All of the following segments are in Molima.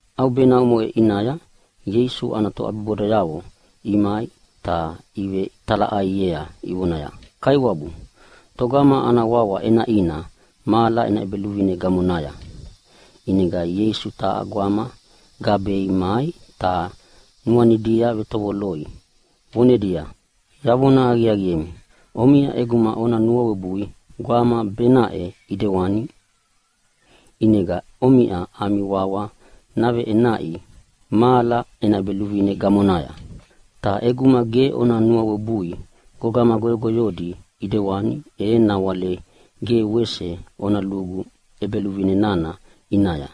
ʼAubena omoʼe ʼinaya Ieisu ana toʼabibodayavo imai ta ivetalaʼaiea ivonaya, “Kaiwabu, togama ana wawa ʼenaʼina mahala ena ʼEbeluvine gamonaya?” ʼInega Ieisu taha gwama gabei mai ta nuanidia vetovoloi, vonedia, “Yavona aqiaqiemi, omiʼa ʼeguma ona nuawebui gwama baʼena ʼidewani, ʼinega omiʼa ami wawa naveʼenaʼi mahala ena ʼEbeluvine gamonaya. Ta ʼeguma ge ona nuawebui gogama goyogoyodi ʼidewani, e nawale ge wese ona lugu ʼEbeluvine nana ʼinaya.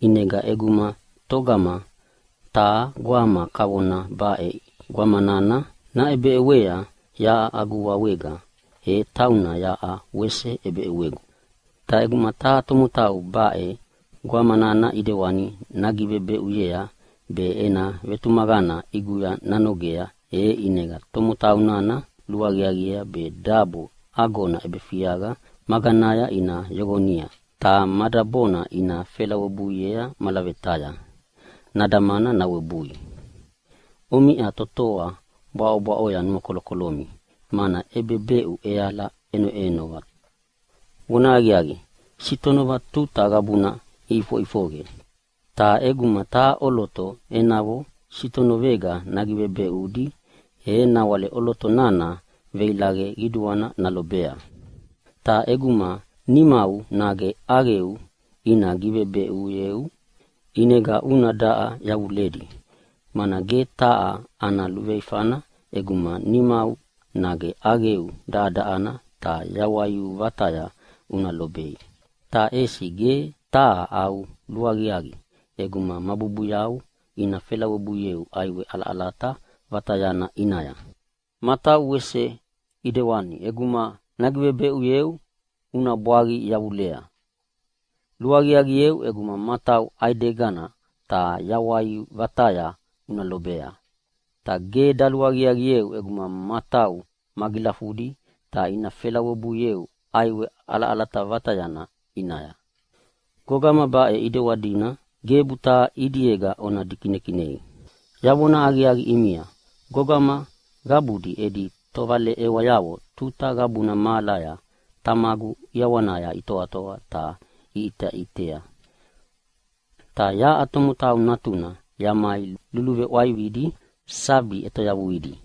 ʼInega ʼeguma togama taha gwama kavona baʼe gwama nana naʼebeʼewea yaʼa agu wawega, e tauna yaʼa wese ʼebeʼewegu. “Ta ʼeguma taha tomotau baʼe gwama nana ʼidewani nagivebeʼuyea be ena vetumaqana ʼiguya nanogea, e ʼinega tomotau nana luaqiaqiea be dabo agona ʼebefiaqa maganaya ina yoqoni, ta ma dabona ina felawebuiea malavetaya nadamana nawebui. Omiʼa totoa bwaʼobwaʼo nuakolokolomi, mana ʼebebeʼu ʼeala ʼenoʼenova. Vonahaqiaqi, sitonova tuta qabuna ʼifoʼifoqe, ta ʼeguma taha ʼoloto enavo sitonovega nagivebeʼudi e nawale ʼoloto nana veilaqe qiduana nalobea. “Ta ʼeguma nimau nage ʼaqeu ina givebeʼuyeu ʼinega una daʼa yavuledi. Mana ge taha ana luveifana ʼeguma nimau nage ʼaqeu daʼadaʼadi ta yawai vataya una lobea, ta ʼesi ge taha au luaqiaqi ʼeguma ma bubuyau ina felawebuieu ʼaiwe ʼalaʼalata vatayana ʼinaya. Matau wese ʼidewani ʼeguma nagivebeʼuyeu una bwaqi yavulea. Luaqiaqieu ʼeguma matau ʼaidegana ta yawai vataya una lobea, ta ge daluaqiaqieu ʼeguma matau magilafudi ta ina felawebuieu ʼaiwe ʼalaʼalata vatayana ʼinaya. “Gogama baʼe ʼidewanina gebu taha ʼidiega ona dikinekinei. Yavona aqiaqi ʼimia, gogama qabudi edi tovaleʼewayavo tuta qabuna mahalaya Tamagu ʼiawanaya itoatoa ta iʼiteʼitea. “[Ta yaʼa Tomotau Natuna yamai luluveʼwaividi sabi ʼetoyavuidi.]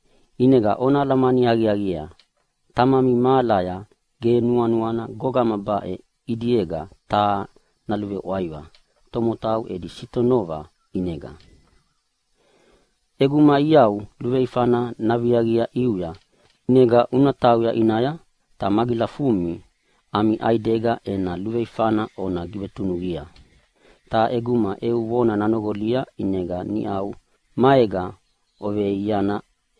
ʼInega ona alamani aqiaqiea, Tamami mahalaya ge nuanuana gogama baʼe ʼidiega taha naluveʼwaiva tomotau edi sitonova ʼinega. “ʼEguma iau luveifana naviaqia ʼiuya, ʼinega una tauya ʼinaya ta magilafumi ami ʼaidega ena luveifana ona givetunuqia. Ta ʼeguma eu vona nanoqolia ʼinega niʼa maega oveiana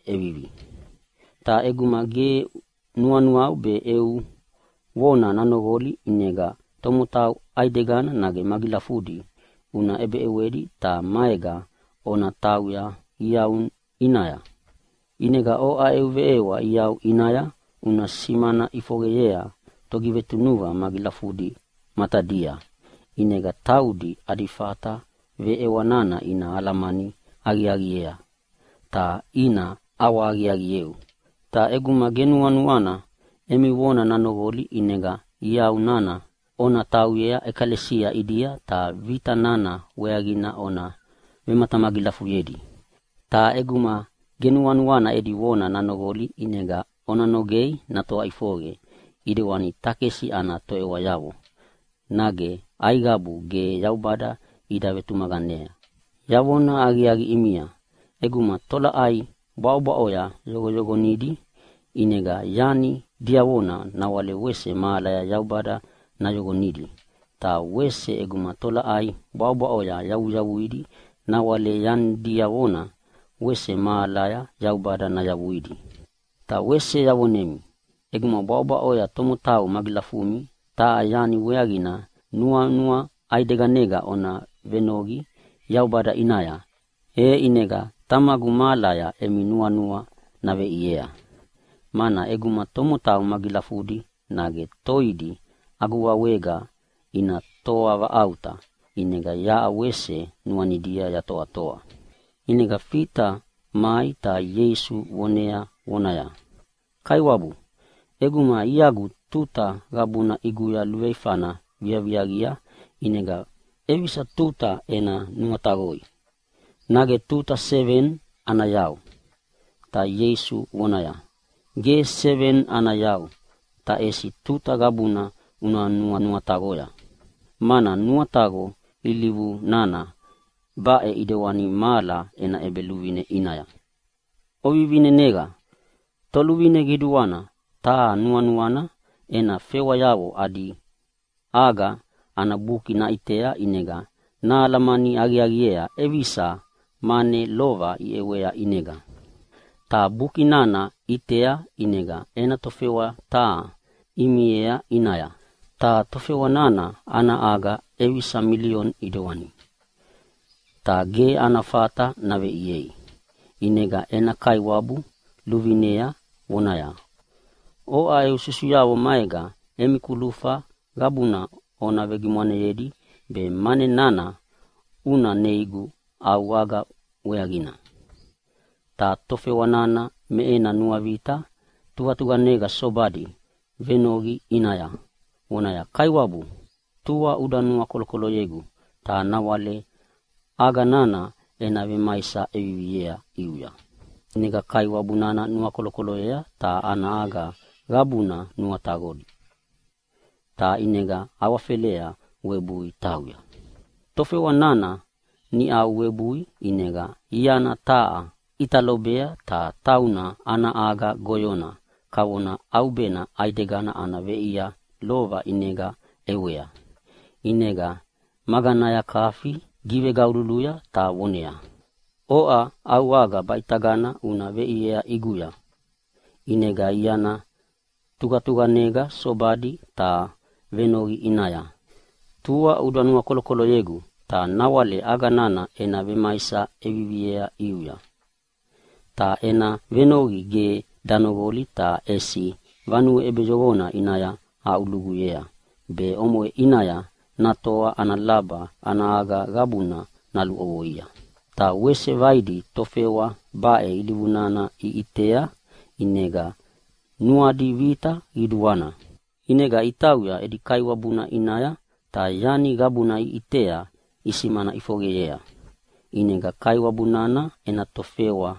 ʼevivi. Ta ʼeguma ge nuana be eu vona nanoqoli ʼinega tomotau ʼaidegina nage magilafudi una ʼebeʼewedi ta maega ona tauya iau ʼinaya. ʼInega oʼa eu veʼewa iau ʼinaya una simana ʼifoqeyea togivetunuqa magilafudina matadia, ʼinega taudi adi fata veʼewa nana ina alamani aqiaqiei be ina ʼawahaqiaqieu. Ta ʼeguma ge nuanuana emi vona nanoqoli ʼinega iau nana ona tauyea ʼekalesia ʼidia ta vita nana weaqina ona vematamagilafuyedi. Ta ʼeguma ge nuanuana edi vona nanoqoli ʼinega ona nogea natoa ʼifoqe ʼidewani takesi ana toʼewayavo, nage aiqabu ge Yaubada ida vetumaqanea. “Yavona aqiaqi ʼimia, ʼeguma tolaʼai bwaʼobwaʼoya oyoqoyoqonidi ʼinega yani diavona nawale wese mahalaya Yaubada nayoqonidi. Ta wese ʼeguma tolaʼai bwaʼobwaʼoya oyavuyavuidi nawale yani diavona wese mahalaya Yaubada nayavuidi. “Ta wese yavonemi, ʼeguma bwaʼobwaʼoya tomotau magilafumi taha yani weaqina nuanua ʼaideganega ona venoqi Yaubada ʼinaya, e ʼinega Tamagu mahalaya emi nuanua naveʼiea. Mana ʼeguma tomotau magilafudi nage toidi agu wawega ina toavaʼauta, ʼinega yaʼa wese nuanidia yatoatoa.” ʼInega Fita mai ta Ieisu vonea vonaya, “Kaiwabu, ʼeguma iagu tuta qabuna ʼiguya luveifana viaviaqia ʼinega ʼevisa tuta ena nuataqoi, nage tuta seveni ana yau?” Ta Ieisu vonaya, “Ge seveni ana yau, ta ʼesi tuta qabuna una nuanuataqoya, mana nuataqo ilivu nana baʼe ʼidewani mahala ena ʼEbeluvine ʼinaya, ovivineneqa! Toluvine qiduana taha nuanuana ena tofewayavo adi aga ana buki naʼitea ʼinega nahalamani aqiaqiea ʼevisa mane lova iʼewei ʼinega. “Ta buki nana ʼiteʼitei, ʼinega ena tofewa taha imiea ʼinaya, ta tofewa nana ana aga ʼevisa milioni ʼidewani. Ta ge ana fata naveʼiei, ʼinega ena kaiwabu luvinea vonaya, ‘Oʼa eu susuyavo maega emi kulufa qabuna ona vegimwaneyedi be mane nana una neigu au aga weaqina!’ Ta tofewa nana me ena nuavita tuqatuqanega sobadi venoqi ʼinaya vonaya, ‘Kaiwabu, tua uda nuakolokoloyegu ta nawale aga nana ena vemaisa ʼeviviea ʼiuya.’ ʼInega kaiwabu nana nuakolokoloyea ta ana aga qabuna nuataqoya, ta ʼinega awafelea webui tauya. “Tofewa nana niʼa webui, ʼinega iana taha ʼita lobea, ta tauna ana aga goyona kavona ʼaubena ʼaidegana ana veʼia lova ʼinega ʼewea. ʼInega maganaya kafi givegaululuya ta voneaya, ‘Oʼa au aga baʼitagana una veʼiea ʼiguya!’ ʼInega iana tuqatuqanega sobadi ta venoqiea vonaya, ‘Tua uda nuakolokoloyegu ta nawale aga nana ena vemaisa ʼeviviea ʼiuya.’ Ta ena venoqi ge danoqolia ta ʼesi vanue ʼebeyoqona ʼinaya aʼuluguyea be omoʼe ʼinaya natoa ana laba ana aga qabuna naluʼovoia. “Ta wese vaidi tofewa baʼe ilivuna iʼitea ʼinega nuadi vita qiduana. ʼInega itauya edi kaiwabuna ʼinaya ta yani qabuna niʼa iʼitea isimana ʼifoqeyea. ʼInega kaiwabu nana ena tofewa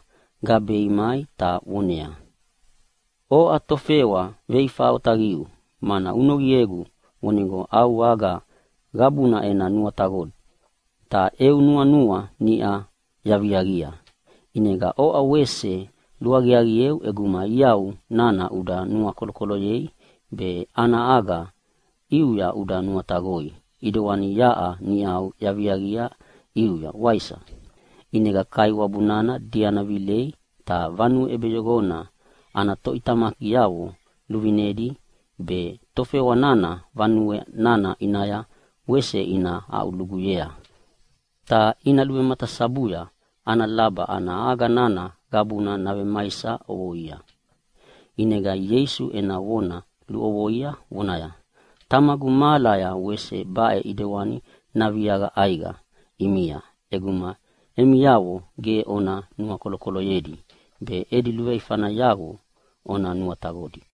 gabei mai ta voneaya, ‘Oʼa tofewa veifa otaqiu, mana uvenoqiegu vonigo au aga qabuna ena nuataqodi, ta eu nuanua niʼa yaviaqia. ʼInega oʼa wese luaqiaqieu ʼeguma iau nana uda nuakolokoloyea be ana aga ʼiuya uda nuataqoi ʼidewani yaʼa niʼa yaviaqia ʼiuya, waisa?’ ʼInega kaiwabu nana diana vilei ta vanue ʼebeyoqona ana toʼitamakiavo luvinedi baʼe tofewa nana vanue nana ʼinaya wese ina aʼuluguyea, ta ina luvematasabuya ana laba ana aga nana qabuna navemaisa ʼovoia.” ʼInega Ieisu ena vona luʼovoia vonaya, “Tamagu mahalaya wese baʼe ʼidewani naviaqa ʼaiqa ʼimia ʼeguma emiavo ge ona nuakolokoloyedi be edi luveifayavo ona nuataqodi.”